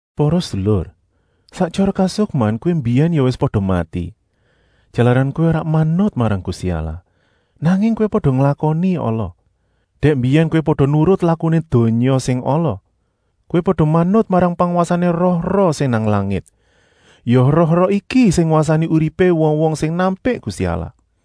Para sedulur, sak tyara kasukman kowé mbiyèn ya wis pada mati, jalaran kowé ora manut marang Gusti Allah, nanging kowé pada nglakoni ala. Dèk mbiyèn kowé pada nurut lakuné donya sing ala. Kowé pada manut marang pangwasané roh-roh sing nang langit; ya roh-roh iki sing ngwasani uripé wong-wong sing nampik Gusti Allah.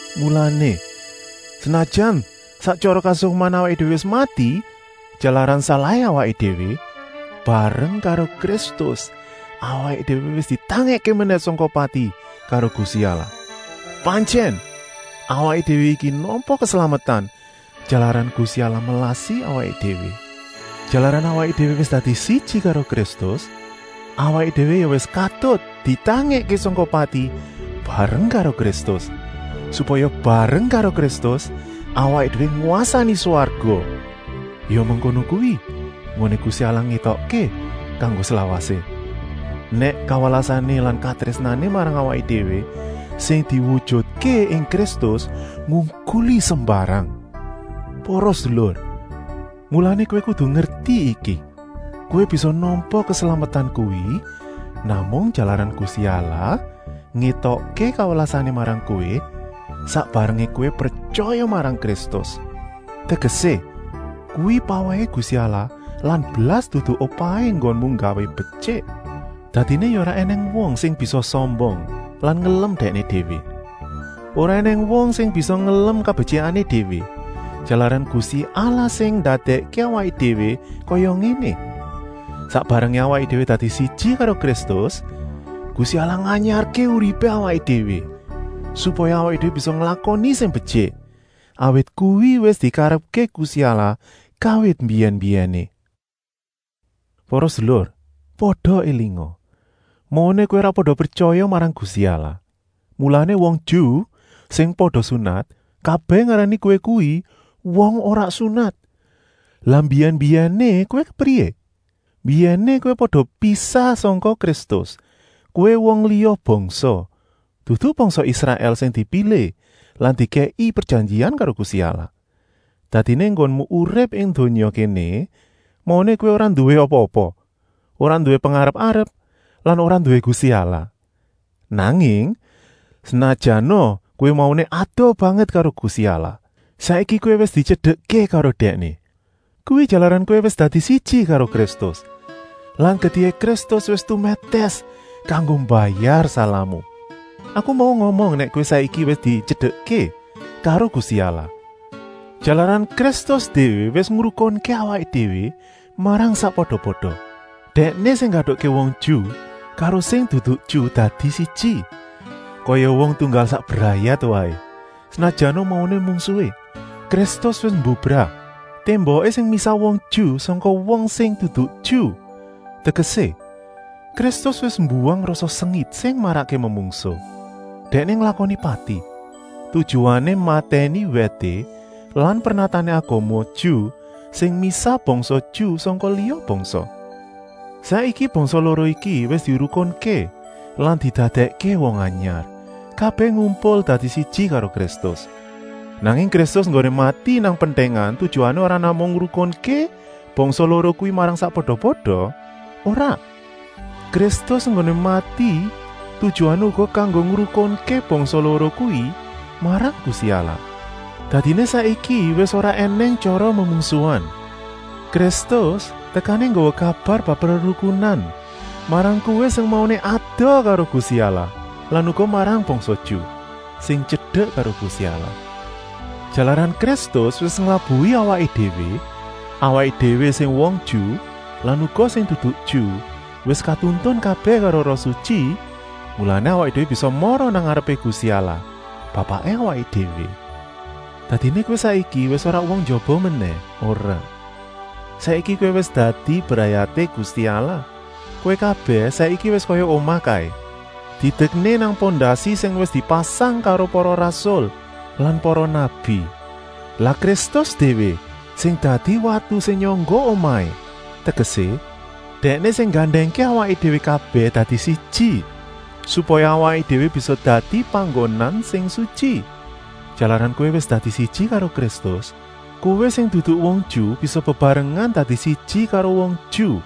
Mulané, senajan sak tyara kasukman awaké déwé wis mati jalaran salahé awaké déwé, bareng karo Kristus awaké déwé wis ditangèkké menèh sangka pati karo Gusti Allah. Pantyèn, awaké déwé iki nampa keslametan, jalaran Gusti Allah melasi awaké déwé. Jalaran awaké déwé wis dadi siji karo Kristus, awaké déwé ya wis katut ditangèkké sangka pati bareng karo Kristus, supaya bareng karo Kristus awaké déwé ngwasani swarga. Ya mengkono kuwi enggoné Gusti Allah ngétokké kanggo slawasé, nèk kawelasané lan katrésnané marang awaké déwé, sing diwujutké ing Kristus, ngungkuli sembarang. Para sedulur, mulané kowé kudu ngerti iki: kowé bisa nampa keslametan kuwi namung jalaran Gusti Allah ngétokké kawelasané marang kowé, sak barengé kowé pretyaya marang Kristus. Tegesé, kuwi pawèhé Gusti Allah lan blas dudu upahé enggonmu nggawé betyik. Dadiné ya ora ènèng wong sing bisa sombong lan ngelem dèkné déwé. Ora ènèng wong sing bisa ngelem kabetyikané déwé, jalaran Gusti Allah sing ndadèkké awaké déwé kaya ngéné. Sak barengé awaké déwé dadi siji karo Kristus, Gusti Allah nganyarké uripé awaké déwé, supaya awaké déwé bisa nglakoni sing betyik, awit kuwi wis dikarepké Gusti Allah kawit mbiyèn-mbiyèné. Para sedulur, pada élinga! Mauné kowé ora pada pretyaya marang Gusti Allah, mulané wong Ju, sing pada sunat, kabèh ngarani kowé kuwi “wong ora sunat”. Lah mbiyèn-mbiyèné kowé kepriyé? Mbiyèné kowé pada pisah sangka Kristus, kowé wong liya bangsa, dudu bangsa Israèl sing dipilih lan dikèki prejanjian karo Gusti Allah. Dadiné enggonmu urip ing donya kéné mauné kowé ora nduwé apa-apa, ora nduwé pengarep-arep lan ora nduwé Gusti Allah. Nanging, senajana kowé mauné adoh banget karo Gusti Allah, saiki kowé wis dityedekké karo Dèkné. Kuwi jalaran kowé wis dadi siji karo Kristus lan getihé Kristus wis tumètès kanggo mbayar salahmu. Aku mau ngomong nèk kowé saiki wis dityedekké karo Gusti Allah, jalaran Kristus déwé wis ngrukunké awaké déwé marang sakpada-pada. Dèkné sing nggatukké wong Ju karo sing dudu Ju dadi siji, kaya wong tunggal sak brayat waé, senajana mauné mungsuhé. Kristus wis mbubrah témboké sing misah wong Ju sangka wong sing dudu Ju, tegesé, Kristus wis mbuwang rasa sengit sing marakké memungsuh. Dèkné nglakoni pati, tujuané matèni wèté lan pernatané agama Ju sing misah bangsa Ju sangka liya bangsa. Saiki bangsa loro iki wis dirukunké lan didadèkké wong anyar, kabèh ngumpul dadi siji karo Kristus. Nanging Kristus enggoné mati nang pentèngan tujuané ora namung ngrukunké bangsa loro kuwi marang sakpada-pada, ora. Kristus enggoné mati tujuané uga kanggo ngrukunké bangsa loro kuwi marang Gusti Allah. Dadiné saiki wis ora ènèng tyara memungsuhan. Kristus tekané nggawa kabar bab rerukunan marang kowé sing mauné adoh karo Gusti Allah lan uga marang bangsa Ju, sing tyedek karo Gusti Allah. Jalaran Kristus wis nglabuhi awaké déwé, awaké déwé sing wong Ju lan uga sing dudu Ju wis katuntun kabèh karo Roh Sutyi, mulané awaké déwé bisa mara nang ngarepé Gusti Allah, Bapaké awaké déwé. Dadiné kowé saiki wis ora wong njaba menèh, ora! Saiki kowé wis dadi brayaté Gusti Allah. Kowé kabèh saiki wis kaya omah kaé, didekné nang pondasi sing wis dipasang karo para rasul lan para nabi. Lah Kristus déwé sing dadi watu sing nyangga omahé, tegesé, Dèkné sing nggandèngké awaké déwé kabèh dadi siji, supaya awaké déwé bisa dadi panggonan sing sutyi. Jalaran kowé wis dadi siji karo Kristus, kowé sing dudu wong Ju bisa bebarengan dadi siji karo wong Ju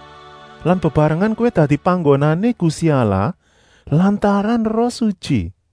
lan bebarengan kowé dadi panggonané Gusti Allah lantaran Roh Sutyi.